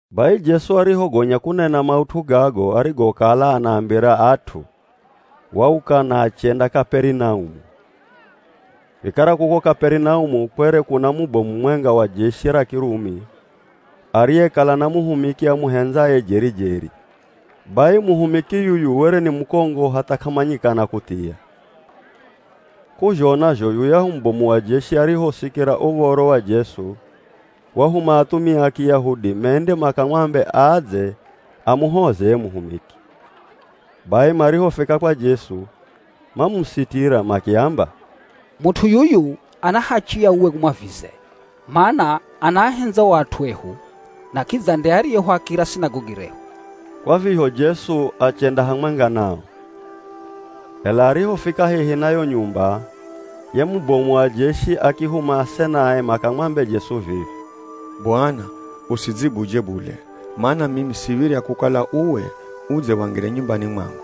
Bai Jesu arihogonya kunena maut'u gago arigokala anaambira at'u, wauka na achenda Kaperinaumu. Vikara kuko Kaperinaumu kwere kuna mubomu mumwenga wa jeshi ra Kirumi, ariyekala na muhumiki amuhendzaye jeri-jeri. Bai muhumiki yuyu were ni mukongo hatha k'amanyikana kuthia. K'uzhona zho yuyahu mubomu wa jeshi arihosikira uv̱oro wa Jesu, wahuma athumia a Kiyahudi mende makamwambe adze amuhoze ye muhumiki. Bai marihofika kwa Jesu, mamusitira makiamba, “Mut'u yuyu ana hachi ya uwe umwavize, mana anaahendza o at'u ehu na kidza nde ariyehuakira Sinagogi rehu.” Kwa vizho Jesu achenda hamwenga nao. Ela arihofika hehi na yo nyumba, ye mubomu wa jeshi akihuma asenae makamwambe Jesu vivi, “Bwana, usidzibudzye bule, mana mimi siv̱irya kukala uwe udze wangire nyumbani mwangu,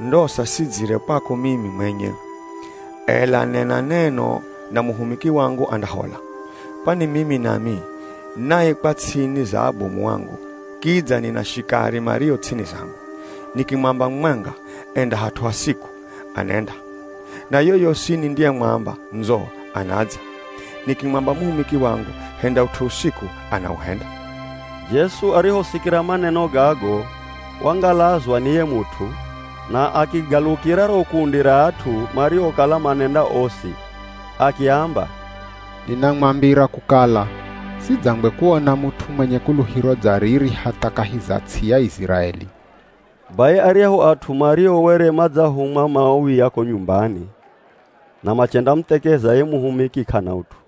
ndosa sidzire kwako mimi mwenye. Ela nena neno na muhumiki wangu andahola. Kwani mimi nami naikwa ts'ini za abomu angu, kidza nina shikari mario ts'ini zangu. Nikimwamba mumwenga, ‘Enda hat'u hasiku,’ anenda. Na yoyosi nindiyemwamba ‘Ndzo,’ anadza. Nikimwamba muhumiki wangu ‘Henda ut'u usiku,’ anauhenda.” Jesu arihosikira maneno gago wangalazwa ni ye mut'u, na akigalukira ro kundi ra at'u mariokala manenda osi, akiamba, “Ninamwambira kukala sidzangwe kuona mut'u mwenye kuluhiro dza riri hatha kahi za ts'i ya Iziraeli.” Bai aryahu at'u mario were madzahumwa mauya ko nyumbani na machendamuthekeza ye muhumiki k'ana ut'u.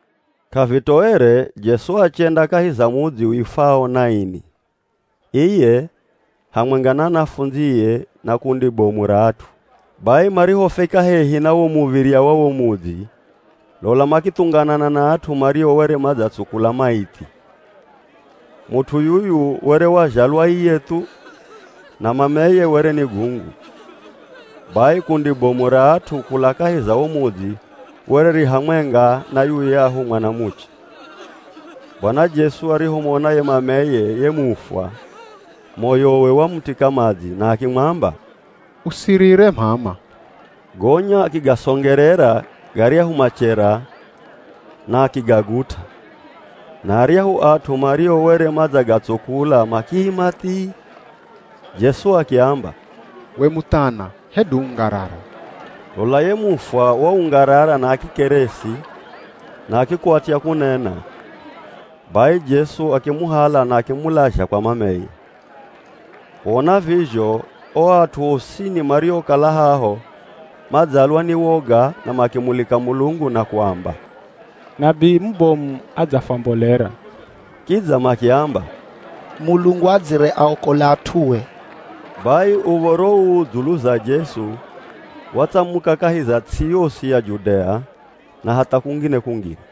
K'avitoere, Jesu achenda kahi za mudzi uifwao Naini, iye hamwenga na anafundzie na kundi bomu ra at'u. Bai marihofika hehi na wo muv̱irya wa wo mudzi lola makithunganana na at'u mario were madzatsukula maithi. Mut'u yuyu were wazhalwa iye thu, na mameye were ni gungu. Bai kundi bomu ra at'u kula kahi za wo mudzi were ri hamwenga na yuyahu mwanamuche. Bwana Jesu arihomona ye mameye ye mufwa, moyowe wamutika madzi na akimwamba, “Usirire m'ama.” Gonya akigasongerera garyahu machera na akigagut'a na aryahu at'u mario were madzagatsukula makiima thii. Jesu akiamba, “We muthana hedu ungarara!” Lola ye mufwa waungarara na akikeresi na akikwatya kunena, bai Jesu akimuhala na akimulazha kwa mameye. Kuona vizho o at'u osini mariokala haho madzalwa ni woga na makimulika Mulungu na kuamba, “Nabii mubomu adzafwambolera.” Kidza makiamba, “Mulungu adzire aokola at'ue.” Bai uv̱oro uu dzulu za Jesu watsamuka kahi za ts'i yosi ya Judea, na hatha kungine-kungine.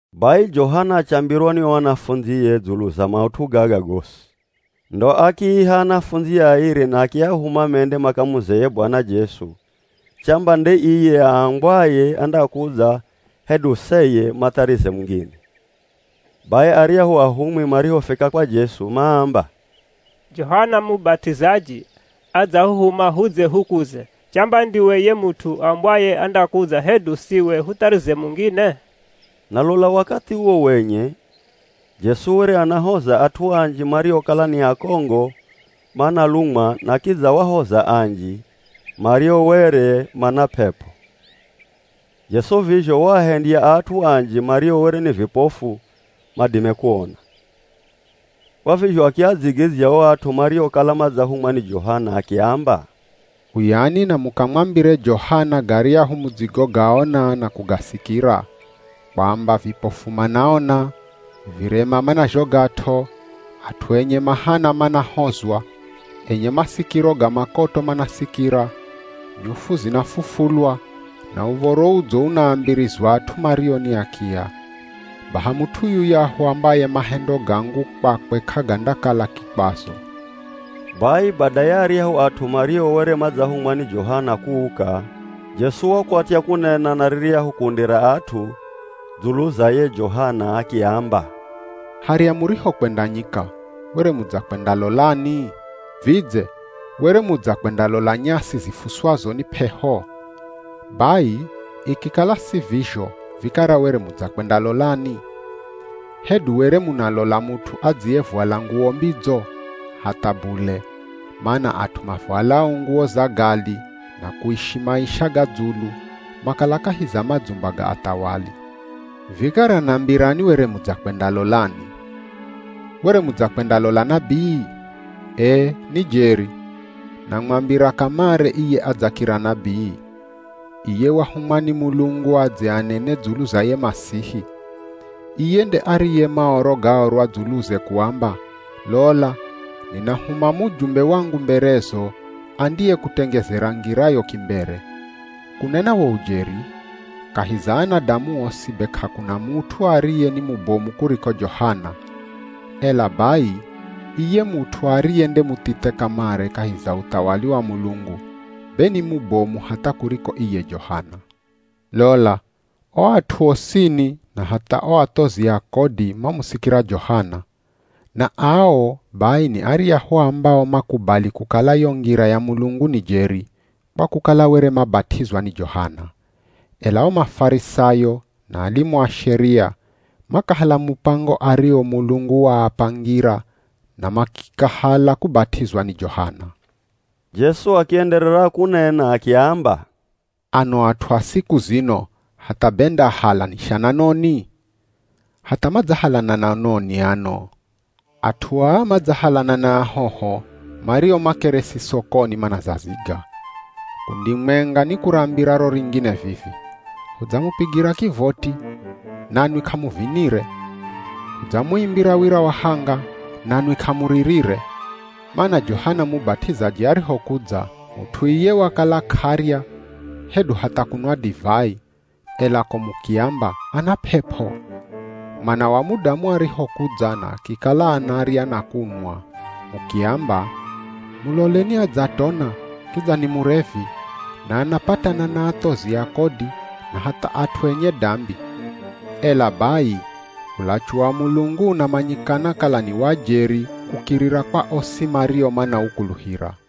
Bai Johana achambirwa ni o anafundzie dzulu za maut'u gaga gosi. Ndo akiiha anafundzie airi na akiahuma mende makamuze ye Bwana Jesu chamba nde iye aambwaye andakudza hedu seye matharize mungine. Bai aryahu ahumwi marihofika kwa Jesu maamba, “Johana Mubat'izaji adzahuhuma hudze hukuze, chamba ndiwe ye mut'u aambwaye andakudza hedu siwe hutharize mungine?” Na lola wakathi uwo wenye Jesu were anahoza at'u anji mariokala ni akongo manalumwa, na kidza wahoza anji mario were mana p'ep'o. Jesu vizho waahendya at'u anji mario were ni vipofu madime kuona. Kwa vizho akiadzigidzya o at'u mariokala madzahumwa ni Johana akiamba, “Uyani na mukamwambire Johana garyahu mudzigogaona na kugasikira, kwamba, vipofu manaona, virema manazhogat'o, at'u enye mahana manahozwa, enye masikiro ga makoto manasikira, nyufu zinafufulwa na Uv̱oro Udzo unaambirizwa at'u mario ni akiya. Baha mut'u yuyahu ambaye mahendo gangu kwakwe k'agandakala kikwazo.” Bai bada ya aryahu at'u mario were madzahumwa ni Johana kuuka, Jesu wakwatya kunena na riryahu kundi ra at'u dzulu za ye Johana, akiamba, “Harya murihokwenda nyika, were mudzakwendalolani? Vidze were mudzakwendalola nyasi zifuswazo ni p'eho? Bai ikikala si vizho vikara were mudzakwendalolani? Hedu were munalola mut'u adziyevwala nguwo mbidzo? Hatha bule! Mana at'u mavwalao nguwo za gali na kuishi maisha ga dzulu makala kahi za madzumba ga athawali. Vikara nambirani were mudzakwendalolani? Were mudzakwendalola nabii? Ee, ni jeri, namwambira kamare iye adzakira nabii, iye wahumwa ni Mulungu adze anene dzulu za ye Masihi. Iye nde ariye Maoro gaorwa dzuluze kuamba, ‘Lola ninahuma mujumbe wangu mberezo, andiyekutengezera ngirayo kimbere.’ Kunena wo ujeri, kahi za anadamu osi be k'akuna mut'u ariye ni mubomu kuriko Johana. Ela bai iye mut'u ariye nde muthithe kamare kahi za uthawali wa Mulungu be ni mubomu hatha kuriko iye Johana.” “Lola o at'u osini na hatha o athozi a kodi mamusikira Johana. Na ao bai ni aryahu ambao makubali kukala yo ngira ya Mulungu ni jeri, kwa kukala were mabat'izwa ni Johana. Ela o Mafarisayo na alimu a Sheria makahala mupango ario Mulungu waapangira na makikahala kubat'izwa ni Johana.” Jesu akienderera kunena akiamba, “Ano at'u a siku zino hatha be ndaahalanisha na noni? Hatha madzahalana na noni ano? At'u aa madzahalana na ahoho mario makeresi sokoni manazaziga. Kundi mwenga nikurambira ro ringine vivi, ‘Hudzamupigira kivoti, nanwi k'amuvinire; Hudzamuimbira wira wa hanga, nanwi k'amuririre.’ Mana Johana Mubat'izaji arihokudza, mut'u iye wakala k'arya hedu hatha kunwa divai, ela ko mukiamba, ‘Ana p'ep'o.’ Mwana wa Mudamu arihokudza na akikala anarya na kunwa, mukiamba, ‘Muloleni adzatona, kidza ni murevi, na anapatana na athozi a kodi na hatha at'u enye dambi.’ Ela bai ulachu wa Mulungu unamanyikana kala ni wa jeri kukirira kwa osi mario manaukuluhira.”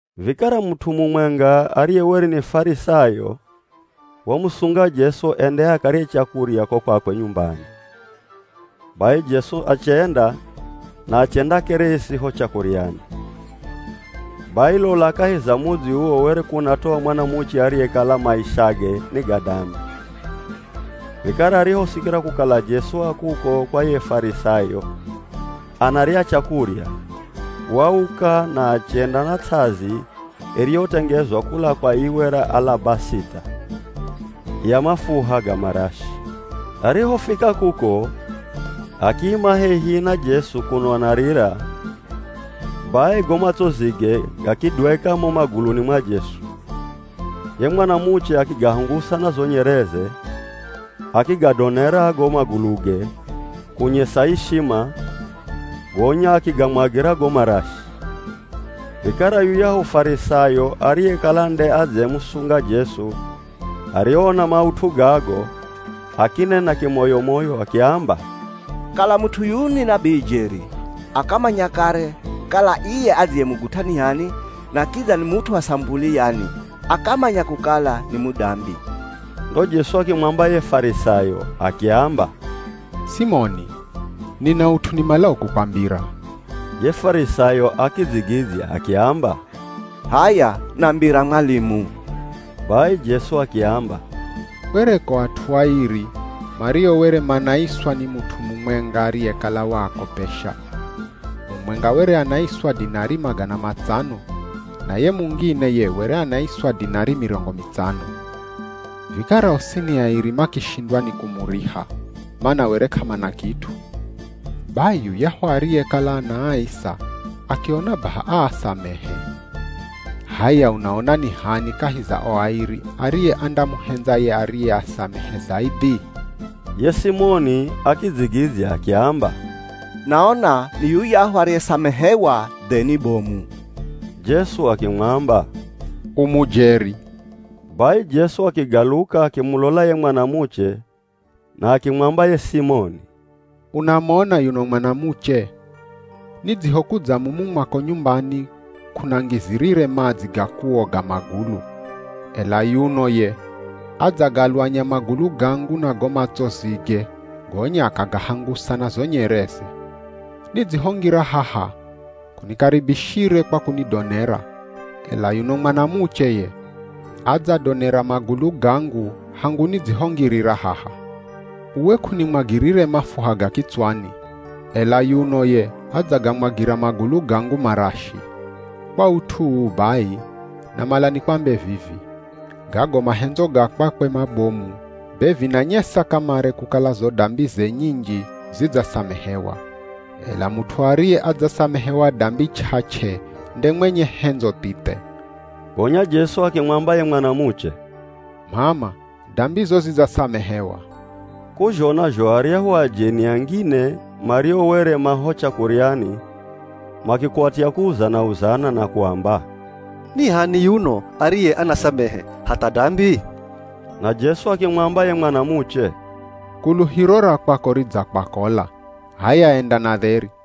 Vikara mut'u mumwenga ariye were ni Farisayo wamusunga Jesu ende akarye chakurya ko kwakwe nyumbani. Bai Jesu achenda na achendakeresi ho chakuryani. Bai lola kahi za mudzi uwo were kunatoa mwanamuche ariyekala maishage ni ga dambi. Vikara arihosikira kukala Jesu a kuko kwa ye Farisayo anarya chakurya, wauka na achenda na ts'azi iriyotengezwa kula kwa iwe ra alabasita ya mafuha ga marashi. Arihofika kuko, akiima hehi na Jesu kuno anarira, bai go matsozige gakidweka mo maguluni mwa Jesu. Ye mwanamuche akigahangusa na zo nyereze, akigadonera go maguluge kunyesa ishima, gonya akigamwagira go marashi. Vikara yuyahu Farisayo ariyekala nde adzemusunga Jesu arihoona maut'u gago, akinena kimoyo-moyo akiamba, “Kala mut'u yuyu ni nabii jeri, akamanya kare, kala iye adziyemugut'a ni h'ani na kidza ni mut'u wa samupuli yani, akamanya kukala ni mudambi.” Ndo Jesu akimwamba ye Farisayo akiamba, “Simoni, nina ut'u nimalao kukwambira.” Ye Farisayo akidzigidzya akiamba, “H'aya nambira mwalimu.” Bai Jesu akiamba, “Kwereko at'u airi mario were manaiswa ni mut'u mumwenga ariyekala waakopesha. Mumwenga were anaiswa dinari magana matsano na ye mungine ye were anaiswa dinari mirongo mitsano. Vikara osini airi makishindwa ni kumuriha, mana were k'amana kit'u. Bai yuyahu ariyekala anaaisa akiona baha aasamehe. H'aya unaona ni h'ani kahi za o airi ariye andamuhendza ye ariyeasamehe zaidhi?” Ye Simoni akidzigidzya akiamba, “Naona ni yuyahu ariyesamehewa dheni bomu.” Jesu akimwamba, “U mujeri.” Bai Jesu akigaluka akimulola ye mwanamuche na akimwamba ye Simoni, “Unamona yuno mwanamuche? Nidzihokudza mumu mwako nyumbani k'unangizirire madzi ga kuoga magulu, ela yuno ye adzagalwanya magulu gangu na go matsozige gonya akagahangusa na zo nyereze. Nidzihongira haha k'unikaribishire kwa kunidonera, ela yuno mwanamuche ye adzadonera magulu gangu hangu nidzihongirira haha. Uwe k'unimwagirire mafuha ga kitswani, ela yuno ye adzagamwagira magulu gangu marashi. Kwa ut'u uu bai, namala nikwambe vivi, gago mahendzo ga kwakwe mabomu, be vinanyesa kamare kukala zo dambize nyinji zidzasamehewa. Ela mut'u ariye adzasamehewa dambi ch'ach'e nde mwenye hendzo thithe.” Gonya Jesu akimwamba ye mwanamuche, “M'ama dambizo zidzasamehewa.” K'uzhona zho aryahu ajeni angine mario were ma ho chakuryani makikwatya kuuzana-uzana na kuamba, “Ni h'ani yuno ariye anasamehe hatha dambi?” Na Jesu akimwamba ye mwanamuche, “Kuluhiro ra kwako ridzakwakola, h'aya enda na dheri.”